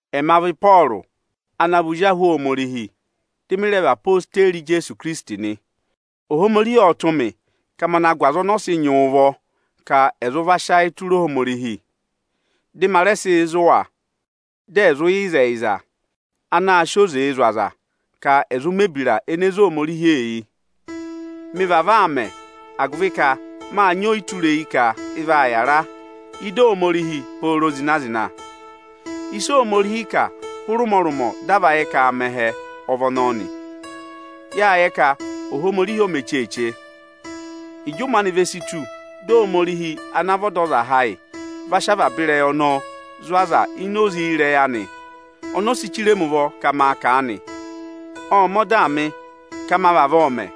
Ẹma vị Ịpọọrụ ana vị ozi ahụ Ohomorihi, dị mị rẹ vị odeyi Ijeesu Ikirisiti nị. Ohomorihi ộ tụ́ mị ka ma na gụ aza ọnị ọ́ sị nyị ụvọ ka ẹ̀ zụ sị ayị tụra a: dị ma rẹ sị zụ̀ wa, dị ẹ̀ zụ yẹ ịzẹyịza anaā sịị oze zụ̀ aza ka ẹ̀ zụụ mẹ̀ ebira ene ze Ohomorihi eyi. Mị vavọọ aa mẹ, agụvị ka máa nyị ọyịtureyi ka ị vaa yàra ịdị Ohomorihi pooro zịna-zịna. Ịsị Ohomorihi kà hụrị ụmọrụmọ dị a va yẹ ka aa mẹ ẹhẹ ọ vị ọnọọ nị. Yáa yẹ ka Ohomorihi o mē cheeche. Ịjị ụmẹ anị ve si tù, dị Ohomorihi ana vị Ọdọzaha ayị va sị avaba ịrẹyị ọnọọ zụ̀ aza ini oze ịrẹyị anị ọnị o si chire mi ụvọ nị Ộ mẹ ọdaa mị ka ma vavọọ mẹ.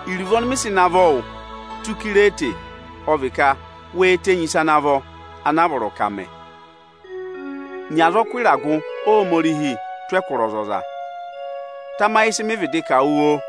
Iruvo ọnị mị sị navọ wụ tụ́ Ikirete ọ vị ka we tenyi ịsa ana a vọrọ ka à mẹ nị. Nyị azọkụ ịragụ Ohomorihi tụ́ ẹkụra ọzọza. Tamayị ịsị mị vịdị kà wụ oo!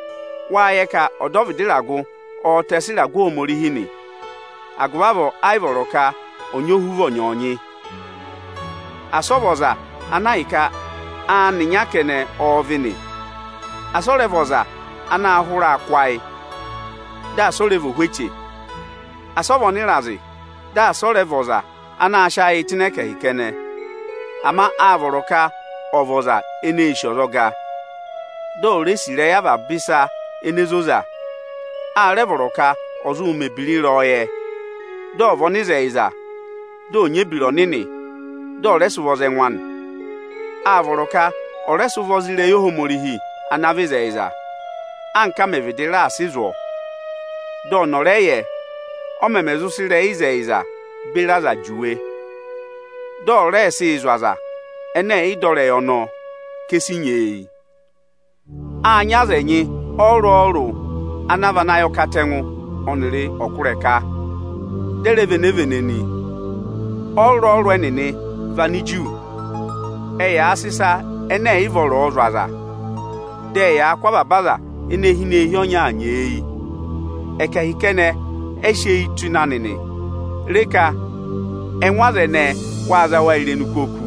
Agụvị ka ọdọvịdị ịragụ o si eyi pe ịragụ Ohomorihi, ẹ́ yị vọrọ ka ọ̀ nyị ohuvọ ọnyọọnyị. Asị ọ vị ọza ana ahịka aanị ịnya kẹnẹ ọọ̄ dụ nị, asị ọ rẹ vị ọza anaā hụraa kụ́ ayị, dị asị ọ́ rẹ vị ohweche. Asị ọ vị ọnịrazị, dị asị ọ rẹ vị ọza anaā sịị ayị tụ́ ịnị ẹkẹhị kẹnẹ. Ama áa vọrọ ka ọ̀ vị ọza eneē sì ọzọga, dị ó re sì avaba ịsa ene zoza. Áa rẹ vọrọ ka ọ̀ zụ mẹ̀ ebira ịrẹyọyẹ, dị ọ̀ vị ọnịzẹyịza, dị ọ̀ nyị ebira ọnịnị, dị ọ̀ rẹ sị ụvọ za ẹngụ anị. Áa vọrọ ka ọ̀ rẹ sị ụvọ za ịrẹyị Ohomorihi ana vị ịzẹyịza, anka á mẹ vịdị raà sị zụ̀ ọ: dị ọnị ọ̀ rẹ yẹ ọ mẹmẹ zụ sị ịrẹyị ịzẹyịza beri aza juwe, dị ọ̀ rẹẹ sịị zụ̀ aza ẹnẹ ẹ̀ yị dọ ịrẹyị ọnọọ ka, e si nyeeyi. Áa nyị aza ẹnyị ọrụrụ-ọrụrụ ana vị anayọkatẹngụ, ọkụrẹka, dị ẹ rẹ vị enevene nị. Ọrụrụ-ọrụrụ ẹnịnị vị Aniju. Ẹyaa sị ịsa ẹnẹ ẹ̀ yị vọrọọ zụ̀ aza. Dị ẹyaa kụ́ avaba aza ene hi ini eehi ọnyaa nyeeyi. Ẹkẹhị kẹnẹ ẹ sị eyi tụ́ ịnị anị nị. Re ka ẹngụ aza ẹnẹẹ waa za wa irenu kú oku.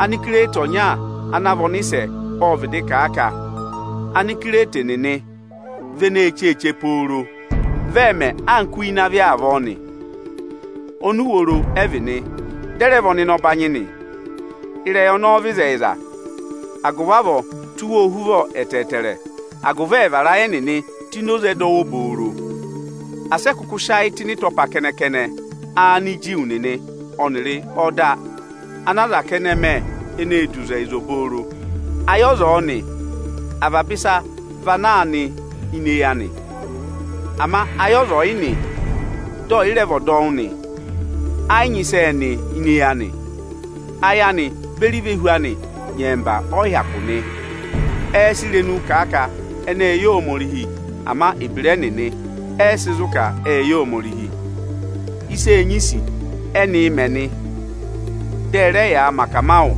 Anikirete ọnya ana vị ọnịsẹ ộ vịdị kà a ka: Anikirete nịnị vị enee cheeche pooro, vị ẹẹ̄ mẹ anka uye ịnị avị avọọ nị. Onuworo ẹ vị nị, dị ẹ rẹ vị ọnịnọbanyị nị. Ịrẹyị ọnọọ vị ịzẹyịza. Agụvị avọọ, tụ́ wa ohuvọ ẹtẹẹtẹrẹ, agụvị ẹ̀ vara ayị ẹnịnị tụ́ ini oze ẹdọwụ obooro. Asị ẹ kụkụ sị ayị tụ́ ịnị ịtọpa kẹnẹ-kẹnẹ Aniju nịnị ọnịrị ọda ana aza kẹnẹ mẹ ene ee du ịzẹyịza obooro. Ayị ọza ọ̀ọ nị, avaba ịsa vị ana vaa nị ini eyi anị. Ama ayị ọza ọ̀ yị nị, dị ẹ̀ yị rẹ vị ọdọwụ nị, ẹ yị nyị ịsị ẹẹ̄ nị ini eyi anị. Ayị anị beri ivehu anị nyẹmba ẹ yị hyakụ nị. Ẹẹ̄ sị irenuu kà a ka ẹnị ẹẹ̄ yẹ Ohomorihi, ama ebira ẹnịnị ẹ́ yị sị zụ ka ẹ́ẹ yẹ Ohomorihi. Ịsa eenyisi ẹnịnịị̄ mẹ nị, dị ẹ rẹ yaa mẹ akamawụ nị,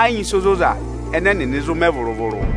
ẹ yị nyị ịsa ozoza ẹnẹ ẹnịnị zụ mẹ vụrụ-vụrụ.